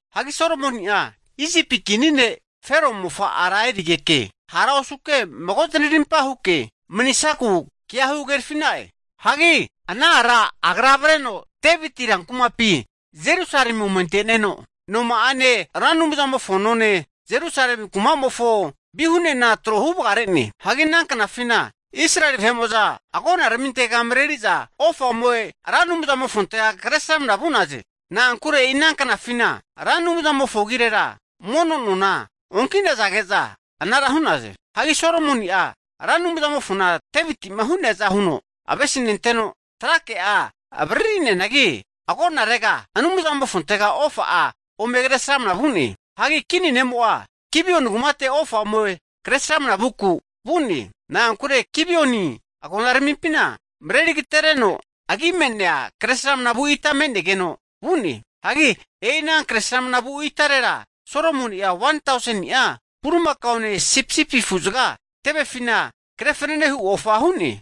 Hagi Solomoni'a Isipi kini ne' Fero mofa'a ara erigeke, hara osuke mago zanarimpa huke manisaku kea huhagerafi'na'e. Hagi ana ara agra avreno Deviti rankumapi Jerusalemi ome ante'neno, noma'ane, Ra Anumzamofo none, Jerusalemi kumamofo vihunena trohu vagare'ne. Hagi ana knafina Israeli agonaramintega mareri'za ofa ome Ra Anumzamofontega kresramna vu'naze. Na'ankure e'ina knafina Ra Anumzamofo agirera mono nona onki'nazage'za anara hu'naze. Hagi Solomoni'a Ra Anumzamofona Deviti'ma hu'neaza huno avesinenteno trakea avaririneanagi, agonarega vuno Anumzamofontega ofa'a ome kresramna vu'ne. Hagi kini ne'mo'a Gibioni kumate ofa ome Kresramana vuku vu'ne. Na'ankure Gibioni agonaramimpina mareri agatereno agi me'nea kre sramnavu ita me'negeno vu'ne. Hagi e'i ana kre sramnavu itarera Solomoni'a 1tauseni'a bulimakaone sipisipi afuzaga tevefina kre fananehu ofa hu'ne.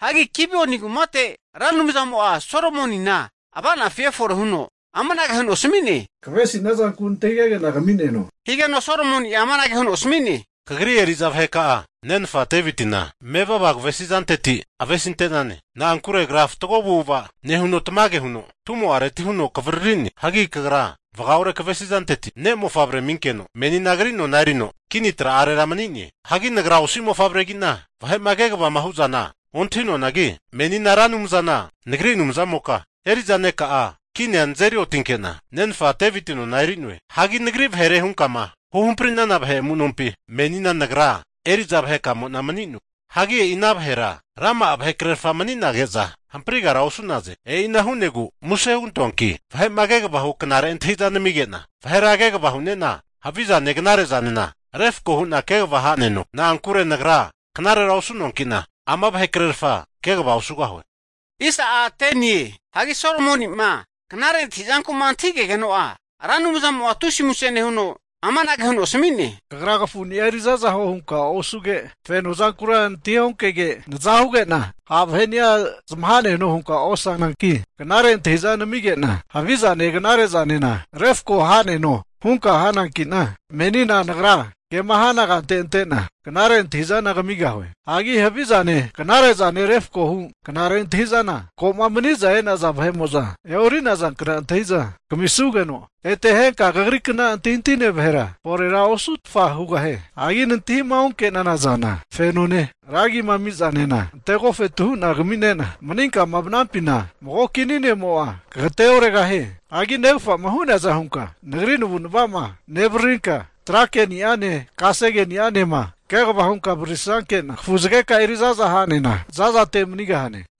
Hagi Gibioni kumate Ra Anumzamo'a Solomonina ava'nafi efore huno amanage huno asami'ne, Kavesinia zanku nantahigege'na kami'neno. Higeno Solomoni'a amanage huno asami'ne, Kagri eri'za vaheka'a nenfa Devitina mevava kavesi'zanteti avesinte'nane. Na'ankure agra fatgo avu'ava nehuno tamage huno tumo'areti huno kavariri'ne. Hagi kagra vagaore kavesizanteti ne' mofavrea aminkeno menina agri nona erino kini tra'arera mani'ne. Hagi nagra osi mofavregi'na vahe'ma kegavama hu'zana ontahi'noanagi, menina Ra Anumzana nagri Anumzamoka eri'za neka'a kinia nazeri otinke'na nenfa Deviti nona eri'noe. Hagi nagri vahere hunkama huhamprinana vahe amu'nompi menina nagra eri'za vahekamo'na mani'noe. Hagi e'i ana vahera rama'a vahekrerfa mani'nage'za, hamprigara osu'ne. E'ina hu'negu muse hugantoanki vahe'ma kegavama hu knare antahi'za namige'na vahera kegava hu'ne'na havi zane knare zanena refko hu'na kegava ha'neno. Na'ankure nagra knarera osu'noanki'na ama vahekrerfa kegava osugahue. Hagi Solomoni'ma knare antahi'zanku'ma antahigegeno'a Ra Anumzamo'a tusi muse nehuno, amanage huno asami'ne, Kagra kafuni'a erizaza huo hunka osuge, fenozankura nantahionkege, naza huge'na ha' vaheni'a zamaha'neno hunka osananki, knare antahi'za naminege'na havi zane knare zanena refko ha'neno hunka hananki'na, menina Nagra kema hana kante ante'na knare antahi'zana kamigahue. Hagi havi zane knare'zane refkohu knare antahi'zana ko'ma mani'za e'naza vahe'mo'za e'orinazankna antahi'za kamisugeno, ete henka kagrikna antahintahine vahera forera osutfa hugahie. Hagi nantahima onke'nana zana fenone, ra agima ami'zanena antegofetu hu'na kaminena, maninkama vanampina mago kini ne'mo'a kagateoregahie. Hagi negafa'ma hu'neaza hunka Nagri navu'nava'ma nevaririnka, trake'ni'ane kasege'ni'anema kegavama hunka avaririsankena, kafuzageka'a eri za'za ha'nena zazate manigahane.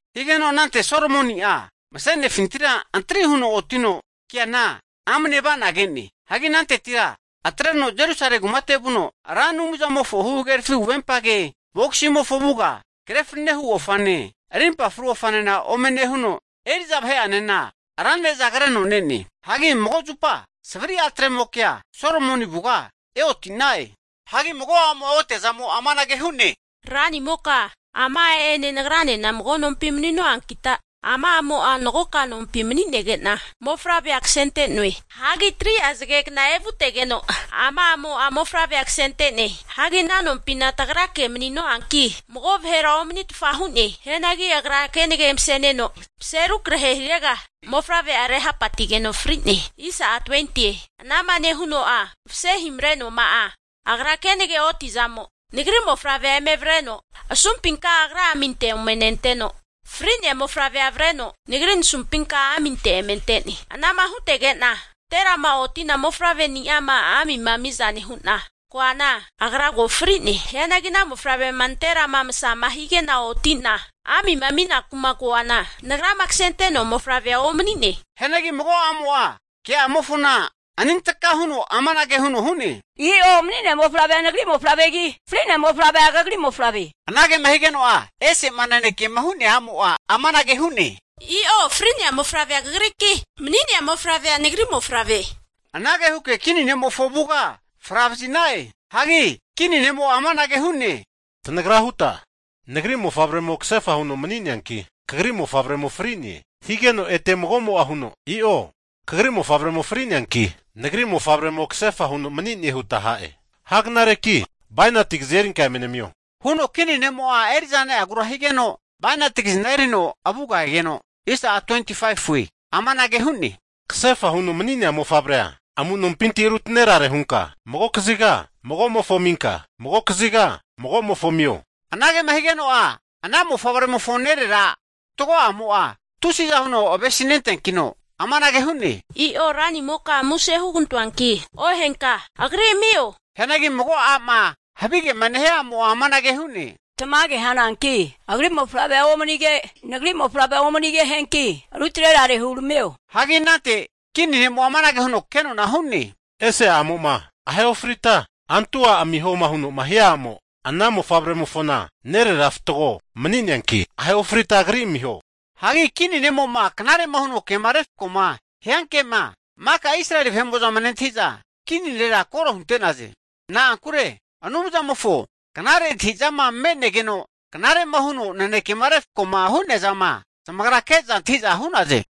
Higeno anante Solomoni'a mase'nefintira antri huno otino keana amne ava'na ke'ne. Hagi anantetira atreno Jerusalemi kumate vuno Ra Anumzamofo huhagerafi huvempage bogisimofo avuga kre fananehu ofane, rimpa fru ofanena ome nehuno, eri'za vahe'anena ra ne'za kreno ne'ne. Hagi mago zupa savri atremokea Solomoni avuga eoti'na'e. Hagi mago a'mo'a otiazamo amanage hu'ne, ranimoka, ama a'ene nagranena mago nompi nemanu'ankita, ama a'mo'a magoka nompi mani'nege'na mofavrea kasente'noe. Hagi 3'a zagegna evutegeno ama a'mo'a, mofavrea kasente'ne. Hagi ana nompina tagrake mani'noanki, mago vahera omanitfa hu'ne. Hianagi agra kenage mase'neno, mase rukrahe hirega mofavre'a rehapatigeno fri'ne. Ana'ma nehuno'a mase himamrenoama'a agra kenage otiazamo nagri mofavrea eme avreno asumpinka agra aminte ome nenteno, fri'nea mofavre'a avreno nagri nasumpinka aminte eme ante'ne. Ana'ma hutege'na nanterama otina mofavreni'ama amima ami'za nehu'na koana, agra ko fri'ne. Hianagi ana mofavrema nanterama masama hige'na oti'na amima aminaku'ma koana, nagrama kasente'noa mofavrea omani'ne. Hianagi mago a'mo'a ke'amofona anintaka huno amanage huno hu'ne, I'o mani'nea mofavrea nagri mofavregi, fri'nea mofavrea kagri mofavre. Anagema higeno'a, ese'ma nanekema hu'nea a'mo'a amanage hu'ne, I'o fri'nea mofavrea kagriki, mani'nea mofavrea nagri mofavre. Anage huke kini ne'mofo avuga fravazi'na'e. Hagi kini ne'mo'a amanage hu'ne, Tanagra huta nagri mofavremo kasefa huno mani'neanki, kagri mofavremo fri'ne, higeno, ete mago'mo'a huno, I'o kagri mofavremo fri'neanki, nagri mofavremo kasefa huno manine huta ha'e. Ha knareki bainati kazi erinka eme namio, huno kini ne'mo'a eri'za ne'agura higeno, bainati kazina erino avuga egeno, amanage hu'ne, Kasefa huno mani'nea mofavrea amu'nompinti rutanerare hunka mago kaziga magomofo aminka, magokaziga magomofo amio. Anagema higeno'a ana mofavremofo nerera fatgo'amo'a tusiza huno avesi nenteankino amanage hu'ne, I'o ranimoka muse hugantoanki ohenka, agri amio huno hu'ne. Hianagi mago a'ma havigema nehia a'mo'a amanage hu'ne, Tamage hananki agri mofavrea omanige nagri mofavrea omanige hanianki, rutnerare huramio huno hu'ne. Hagi anante kini ne'mo'a amanage huno kenona hu'ne, Ese a'mo'ma ahe ofrita antu a' amiho huno'ma hia a'mo ana mofavremofona nerera fatgo mani'neanki ahe ofrita agri amiho. Hagi kini ne'mo'ma knare'ma huno kema refko'ma hianke'ma maka Israeli vahe'mo'zama nentahi'za, kini nera koro hunte'naze. Na'ankure Anumzamofo knare antahizama me'negeno knare'ma huno nanekema refkoma hu'neazana zamagra ke'za antahiza hu'naze.